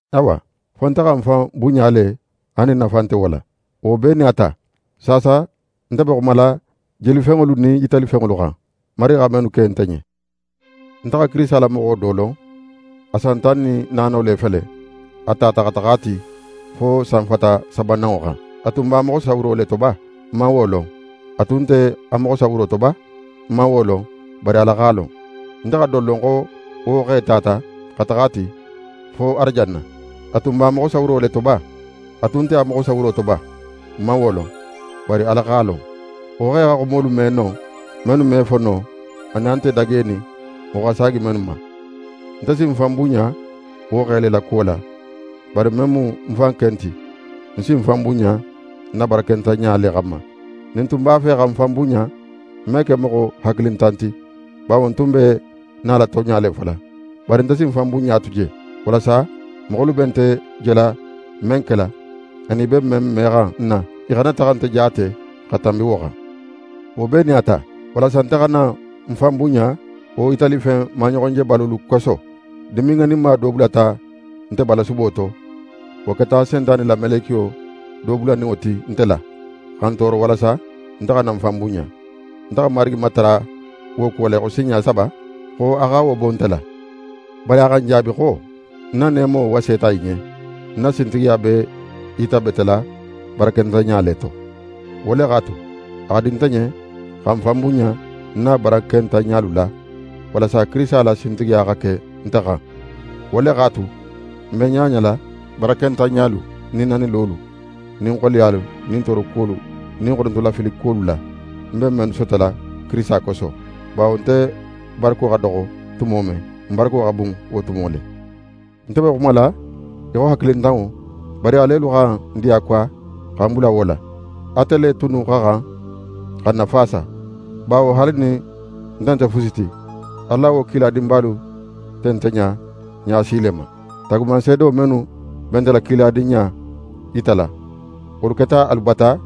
Awa, fo nte xa ń fan bunɲa le haali nin nafa nte wo la. Wo bee nin a ta, saasa nte be xumala jelifenŋolu nin yitalifenŋolu xan, Marigi xa mennu ke nte ɲen. Nte xa Kirisita la moxo do lon, a san tan nin naano le fele, a tata xa taxa a ti fo sanfata sabananŋo xan. A tun b'a moxo sawuro le to ba? Ń man wo lon. A tun nte a moxo sawuro to ba? Ń man wo lon, bari Ala x'a lon. Nte xa don lon xo wo xe tata xa taxa a ti fo arajanna. A tun b'a moxo sawuro le to ba? A tun nte a moxo sawuro to ba? Ń man wo lon, bari Ala x'a lon. Wo xe xa xumolu me non, mennu me fo no anin a nte dagenin moxo xa saagi mennu ma. Nte si ń fan bunɲa wo xe la kuwo la, bari men mu ń fan ken ti, ń si ń fan bunɲa ń na barakentanɲa le xanma. Nin ń tun b'a fe xa ń fan bunɲa, ń me ke moxo hakilintan ti, bawo ń tun be nala tonɲa le fola. Bari nte si ń fan bunɲa tu je, walasa moxolu be nte jela men kela, anin i be men mexan ń na, i xana taxa nte jaate xa tanbi wo xan. Wo bee nin a ta, walasa nte xana ń fan bunɲa wo yitalifen maɲoxonjebalolu koso, dimin ŋaninma do bulata nte balasubo to, wo keta Sentane la melekiyo do bulaninŋo ti nte la, xa ń tooro walasa nte xana ń fan bunɲa. Nte xa Marigi matara wo kuwo la í xo sinɲa saba xo a xa wo bo nte la. Bari a xa ń jaabi xo: «Ń na neemo waseta í ɲen; ń na sintigiya be í yitabetela barakentanɲa le to.» Wo le x'a tu, a xa di nte ɲen xa ń fan bunɲa ń na barakentanɲalu la, walasa Kirisita la sintigiya xa ke nte xan. Wo le x'a tu, ń be ɲaɲala barakentanɲalu nin nanilolu nin xoleyalu nin toorokuwolu nin xonotofilikuwolu la, ń be mennu sotola Kirisita koso. Bawo nte barako xa doxo tumo men, ń barako xa bun wo tumo le. Nte be xumala í xo hakilintanŋo, bari alelu xa ń diyakuwa xa ń bula wo la. Ate le tunnu xa xan xa ń nafaasa. Bawo haali nin nte nte fusi ti, alu la wo kiladinbalu nte nte ɲa, ɲa si le ma. Taagumanseedo mennu be nte la kiladinɲa yitala, wolu keta alu bata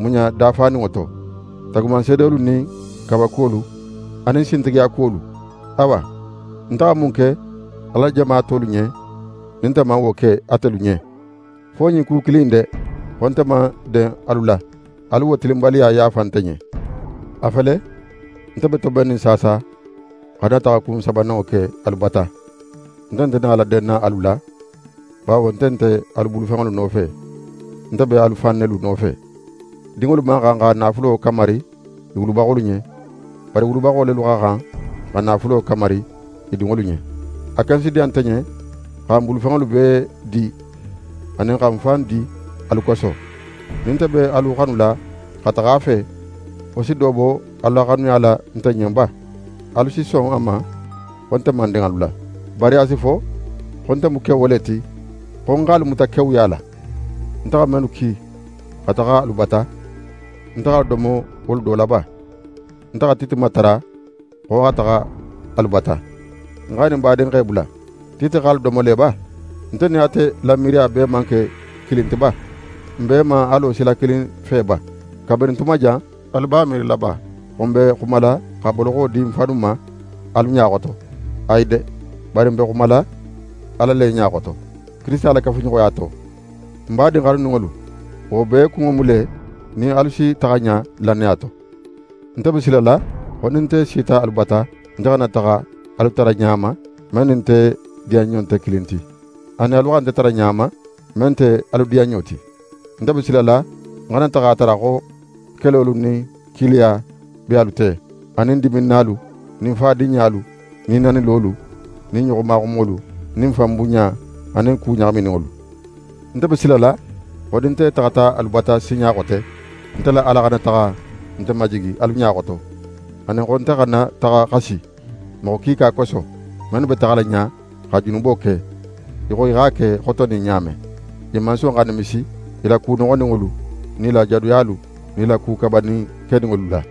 muɲa dafaninŋo to: Taagumanseedolu nin kawakuwolu anin sintigiyakuwolu. Awa, nte xa mun ke Ala la jama tolu ɲen nin nte man wo ke atelu ɲen? Fo ɲin ku kilin in de, xo nte man den alu la! Alu wo tilinbaliya yaafa nte ɲen. A fele, nte be tobennin saasa xa ń na taxakun sabananŋo ke alu bata; nte nte nala denna alu la; bawo nte nte alu bulufenŋolu nofe, nte be alu fan nelu nofe. Dinŋolu man xan xa naafulo kamari i wulubaxolu ɲen, bari wulubaxo lelu xa xan xa naafulo kamari i dinŋolu ɲen. A ken si diya nte ɲen xa ń bulufenŋolu bee di anin xa ń fan di alu koso. Nin nte be alu xanula xa taxa a fe, wo si do bo alu la xanuya la nte ɲen ba? Alu si son a ma xo nte man den alu la. Bari a si fo xo nte mu kewo le ti, xo ń x'alu muta kewuya la. Nte xa mennu ki xa taxa alu bata, nte x'alu domo wolu do la ba? Nte xa Tite matara xo a xa taxa alu bata, ń x'a nin n badinxe bula. Tite x'alu domo le ba? Nte nin ate la miiriya bee man ke kilin ti ba? N bee man a lo sila kilin fe ba? Kabirin tuma jan, alu b'a miirila ba xo n be xumala xa boloxo di n fannu ma alu ɲa xoto? Ayi de, bari n be xumala Ala le ɲa xoto, Kirisita la kafuɲoxoya to. N badin xanuninŋolu, wo bee kunŋo mu le nin alu si taxa ɲa lannaya to. Nte be silala xo nin nte sita alu bata, nte xana taxa alu tara ɲa ma, men nin nte diyanɲo nte kilin ti, anin alu xa nte tara ɲa ma, men nte alu diyanɲo ti. Nte be silala ń xana taxa a tara xo kelolu nin kiiliya be alu te, anin diminnalu nin fadinɲalu, nin nanilolu nin ɲoxomaxumolu nin fanbunɲa anin ku ɲaxamininŋolu. Nte be silala xo nin nte taxata alu bata sinɲa xote, nte la Ala xana taxa nte majigi alu ɲa xoto, anin xo nte xana taxa xasi moxo kiika koso, mennu be taxala ɲa xa junubo ke, í xo i x'a ke xotonin ɲa men. I man son xa nimisi i la ku noxoninŋolu nin i la jadoyalu nin i la ku kabanin keninŋolu la.